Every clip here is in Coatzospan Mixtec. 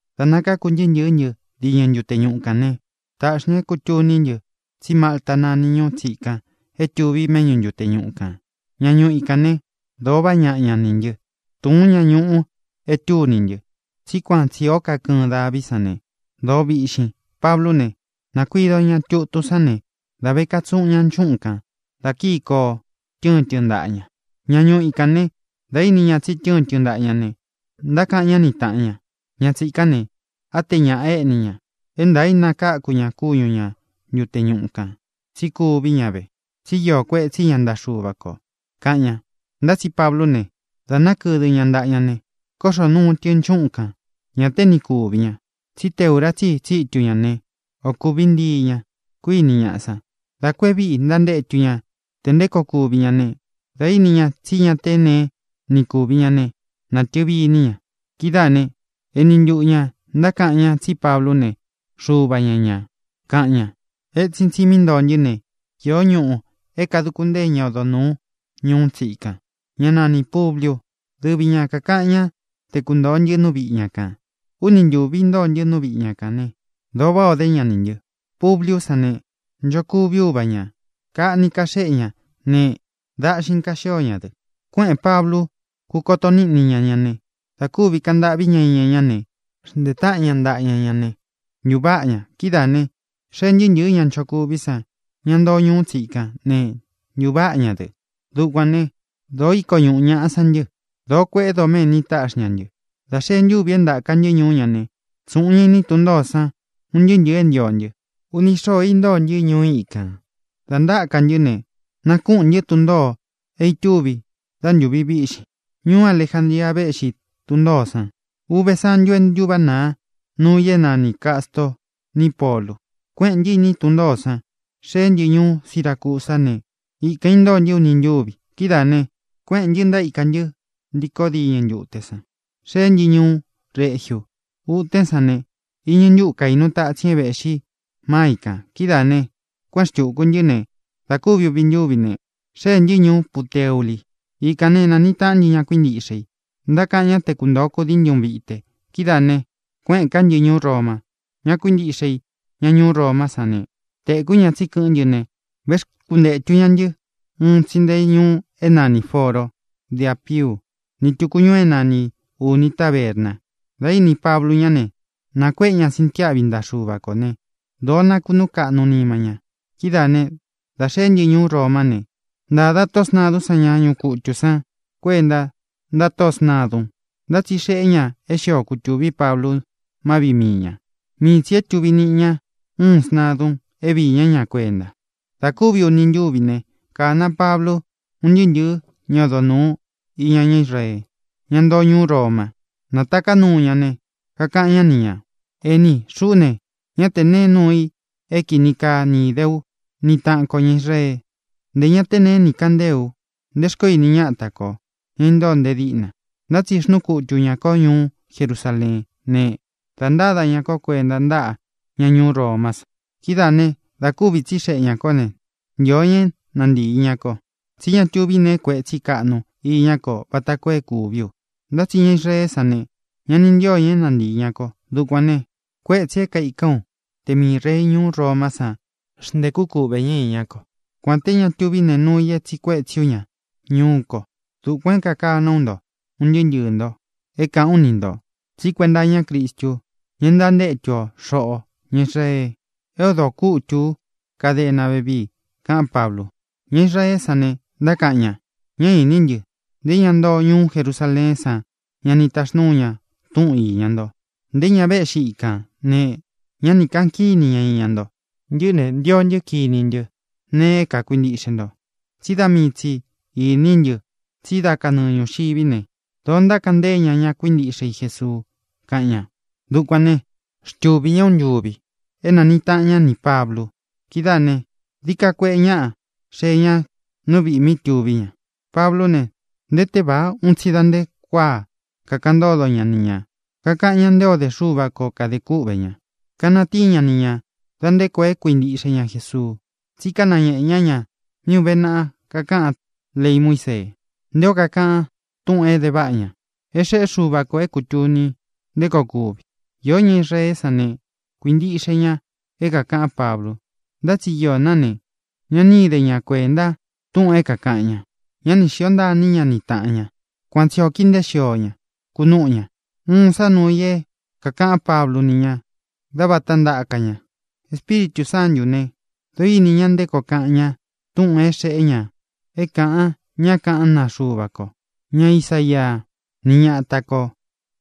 Dā nakákū ntɨɨ́ ntɨ̄ɨ́ ntɨ diñɨ ntute ñuꞌu kān né, tāꞌxi ña é kūtuní ntɨ tsí Malta nani ñuú tsikan é tuvi méꞌñu ntute ñuꞌu kān. Ña ñuu íkān né, dōo vaꞌá ñaꞌa ña nī ntɨ. Tūun ña ñuꞌu é tūní ntɨ, tsí kuan tsī ó kakɨɨn daví san ne, dōó viꞌxin. Pablú ne, nākuido ñá tutun sán ne, da ve katsuꞌun ña nchúꞌun kān da kií koo, tɨ́ɨn tɨ ntaꞌa ña. Ña ñuu íkān né, dā íni ña tsi tɨ́ɨn tɨ ntaꞌa ña ne, ntákaꞌan ñá ni tāꞌan ña: —Ña tsīkán ne, á te ñaꞌa éꞌni ña. É ntaā í nakáku ña kúñu ña ntute ñuꞌu kān, tsí kuví ña ve, tsi íō kuetsí ña ntaꞌa Xuva kō —kaꞌan ña. Ntá tsi Pablú ne, dā nákɨdɨ ña ntaꞌa ña ne, kóꞌxō nuu tɨ nchúꞌun kān. Ña té ni kūvi ña. Tsí te ūra tsí i tsitu ña ne, ō kuví ntii ñā, kuiní ñaꞌa san. Dā kú e víꞌi ntántétu ña te nté koo kuvi ña ne, dā íni ña tsí ña té neé ni kūvi ña ne, natɨvi iní ña. Kidáā né, eni ntuꞌu ñā ntákaꞌan ñá tsí Pablú ne, xuva ña ñā, kaꞌan ña. Etsin tsi mí ntoo ntɨ́ ne, iō ñúꞌū é kāduku ntée ña odo nūú ñuú tsikan, ñá nanī Publiu. Dɨvi ña kākaꞌan ñá te kuntōo ntɨ nú viꞌi ña kān. Úni ntūvi intóo ntɨ nú viꞌi ña kān ne, dōo váꞌā o dé ña nī ntɨ. Publiú san ne, nchokuví uva ñā. Kaꞌni kaxéꞌe ña ne, daꞌxin kaxío ña dɨ. Kuéꞌēn Pablu, kúkoto níꞌni ña ña ne. Dā kúvi kaꞌan ntâꞌví ña iña ñá ne, xntēe táꞌan ña ntaꞌa ña ña ne, ntūváꞌa ña. Kidáā ne, xéē ntɨɨ́ ntɨ̄ɨ́ ña nchokuví san, ña ntoo ñuú tsikán ne, ntūváꞌa ña dɨ. Dukuān né, dōo íko ñuꞌu ñaꞌa san ntɨ. Dōo kueꞌé doméni táꞌxi ña ntɨ. Dā xee ntúvi é ntāka ntɨ́ ñuú ña ne, tsūꞌun ña iní tun ntōó san un ntɨɨ́ ntɨ̄ɨ é ntio ntɨ. Uni xóō intóo ntɨ́ ñuú ikān. Dā ntáka ntɨ́ ne, nākúꞌūn ntɨ́ tun ntōo é itúvi dá ntūvi víꞌxin. Ñuú Alejandria véꞌxi tun ntōó san. Uve santu ntúváꞌa nāa nuu i é nani Cāstoo ni Pólu. Kuéꞌēn ntɨ́ iní tun ntōó san, xéē ntɨ́ ñuú Siracusá ne, ikān intóo ntɨ́ uni ntúvi. Kidáā ne, kuéꞌēn ntɨ́, ntaíka ntɨ́ ntíkō diñɨ ntute san, xéē ntɨ́ ñuú Regiu. Utén san ne, iñɨ ntúꞌu kaīnu tatsin é vēꞌxí máa i kān. Kidáā ne, kuéꞌen xtūku ntɨ́ ne, da kúvi uvi ntúvi ne, xéē ntɨ́ ñuú Puteuli. Ikān né, nāniꞌi taꞌán ntɨ ña kuíntiꞌxe i. Ntákaꞌan ñá te kuntōo kudii ntɨ́ uun vite. Kidáā ne, kuéꞌēn ká ntɨ ñuú Roma. Ña kuíntiꞌxe i, ña ñuú Romá san ne, tēkú ña tsí kɨꞌɨ́n ntɨ ne, véxkuntētu ña ntɨ́ un tsi nte ñuu é nanī Foro de Ápiu ni tūku ñuu é nanī Uni Tabérna. Dā íni Pablu ñá ne, nākuéꞌe ña sintiáꞌvi ntaꞌa Xuva kō ne, dōo nakunúu kaꞌnu nima ña. Kidáā né, dā xeé ntɨ ñuú Romá ne, ntāda tóꞌō sntadún san ña ñuꞌu kutū san kuenta ntáꞌa tóꞌō sntadun, ntá tsi xeꞌé ña é xio kutūví Pablu má viꞌi mii ñā. Mii tsī é tuvi niꞌi ña uún sntadun é viī ñá ña kuenta. Dā kúvi uni ntúvi ne, kāna Pablu un ntɨɨ́ ntɨ̄ɨ́ ña odo nūu iña ñá Israee, ña ntoo ñuú Roma, nátaká nuu ña ne, kakaꞌan ñá ni ñā: —Ení, xuꞌú ne, ñá tē nee nuu i é kini kaa ni īde ú ni tāꞌan ko ñá Israee, nté ña te nee ni kaꞌan ntée u nte xkoó ini ñáta kō, ña intóo nte díꞌna. Ntá tsi xnúu kutu ñā kó ñuú Jerusaleén ne, dā ntáda ña kó kuenta ntáꞌa ña ñuú Romá san. Kidáā né, dā kúvi tsíxeꞌe ñā kó ne, ntīo ña é nantīi ña ko, tsí ña tuví nee kuetsí kaꞌnu iñá ko vata koo é kūví u. Ntá tsi ña Israeé san ne, ña ni ntío ña é nantīi ña ko. Dukuān ne, kuétsī é kaikán u te miī rei ñuú Romá san xntēkú kuꞌvē ñá iñá ko, kuān té ña tuví nēe nuu i é tsīꞌi kuétsi ú ña ñuú ko. Dukuān é kākaná u nto, un ntɨɨ́ ntɨɨ̄ nto, é kāꞌán u ni ntō, tsí kuenta iñá Cristu, ña é ntantétu o, xoꞌō ña Israee, é odō kútu ú kadena vévii —kaꞌán Pablu. Ña Israeé san ne, ntákaꞌan ña: —Ñá īní ntɨ. Nté ñá ntoo ñuú Jerusaleén san ñá ni taxnūu ña túꞌun īña nto. Nté ña véꞌxi ikān ne, ñá ni kāꞌan kíni ña iña nto. Ntɨꞌɨ́ ne, ntio ntɨ́ kiní ntɨ nee é kākuintiꞌxe nto. Tsí da mii tsī iní ntɨ tsí da kanɨɨ ñūxiví ne, dōó ntákaꞌan ntée ña ña kuíntiꞌxe i Jesuu —kaꞌan ña. Dukuān né, xtuvī ñá uun ntuvi é nāniꞌi taꞌan ñá nī Pablu. Kidáā ne, dií ka kueꞌe ñaꞌá xee ña nú viꞌī mí tuví ña. Pablú ne, nté tevāa un tsi da nte kuáa kakaꞌan ntódo ña ni ñā. Kakaꞌan ñá nté ō dé Xuva ko kadē kúꞌvē ña, kanatíin ña ni ñā da nte koo e kuíntiꞌxe ña Jesuu, tsí kanañēꞌe ñá ña mí ūve naꞌa kakaꞌan léi Muísee, nté o kakaꞌan túꞌūn é de váꞌa ña é xeꞌé Xuva kō é kūtuni nté koo kuvi. Īó ña Israeé san ne, kuīntiꞌxe ña é kākaꞌán Pablu, ntá tsi iō ná ne, ña ni íde ña kuēnta túꞌūn é kākaꞌan ña. Ñá ni xīo ntaa iní ña ni tāꞌan ña. Kuan tsi ō kíi nteé xio ña, kunúꞌu ña. Uun sá nuu i é kākaꞌán Pablu ni ña dá vāta ntaka ña: —Espíritū Sántū né, dōo íni ña nté koo kaꞌan ñá túꞌūn é xeꞌé ña é kāꞌan ñá kaꞌán naa Xuva ko, ña Isaía, ni ñata kō,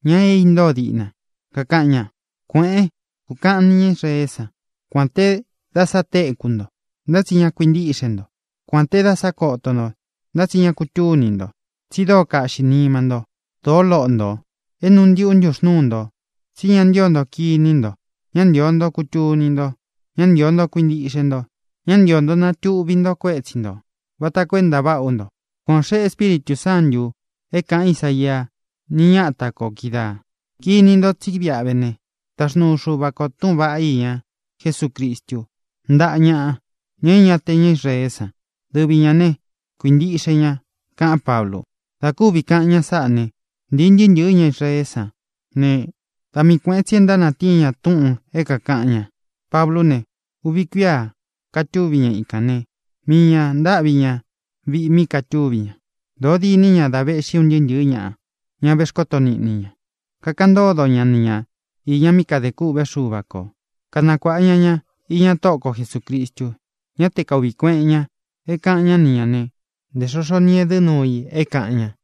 ña é intóo diꞌna, kakaꞌan ña: Kuēꞌén, kūkaꞌan ni ñá Israeé san: Kuān té dáꞌa sa tekú nto, ntá tsí ña kuintíꞌxe nto. Kuān té dáꞌa sa kóto nto, ntá tsi ña kutúni nto. Tsi dóo kaꞌxī nima nto, dóo loꞌo ntō, é nuu ntiꞌu ntúxnūú nto. Tsi ña ntío nto kiní nto, ñá ntīo nto kutuni nto, ñá ntīo nto kuintiꞌxe nto, ñá ntīo nto natuꞌvi nto kuétsi ntō vata koo é ntaváꞌa ú nto. Kuan ō xeꞌé Espíritū Sántū é kāꞌan Ísaia ni ñata kō kídaā. Kini nto tsí viꞌa ve ne, taxnuu Xuva kō túꞌūn vaꞌá iña Jesúcristu ntáꞌa ñaꞌa, ña é ña te ña Israeé san. Dɨvi ñā ne, kuintiꞌxe ña —kaꞌán Pablu. Dā kúvi kaꞌan ña sáꞌa ne, ntīi ntɨɨ́ ntɨ̄ɨ́ ña Israeé san ne, da mii kuēꞌen tsi é ntánatíin ña túꞌūn é kākaꞌan ña. Pablú ne, uvi kuíā katúvi ña ikān né, mii ñā ntáꞌvi ña viꞌi mí katúvi ña. Dōo diní ña dá vēꞌxí un ntɨɨ́ ntɨ̄ɨ́ ñaꞌa, ña vexkóto niꞌni i ña. Kakaꞌan ntódo ña ni ña īña mí kadē kûꞌvé Xuva ko, kanakuāꞌa ña ña iña Tóꞌo ko Jesūcristu. Ñá te kaūꞌví kueꞌen ña é kāꞌan ñá ni ñā né, ntē xoxo ni edɨ́ nuu i é kāꞌan ña.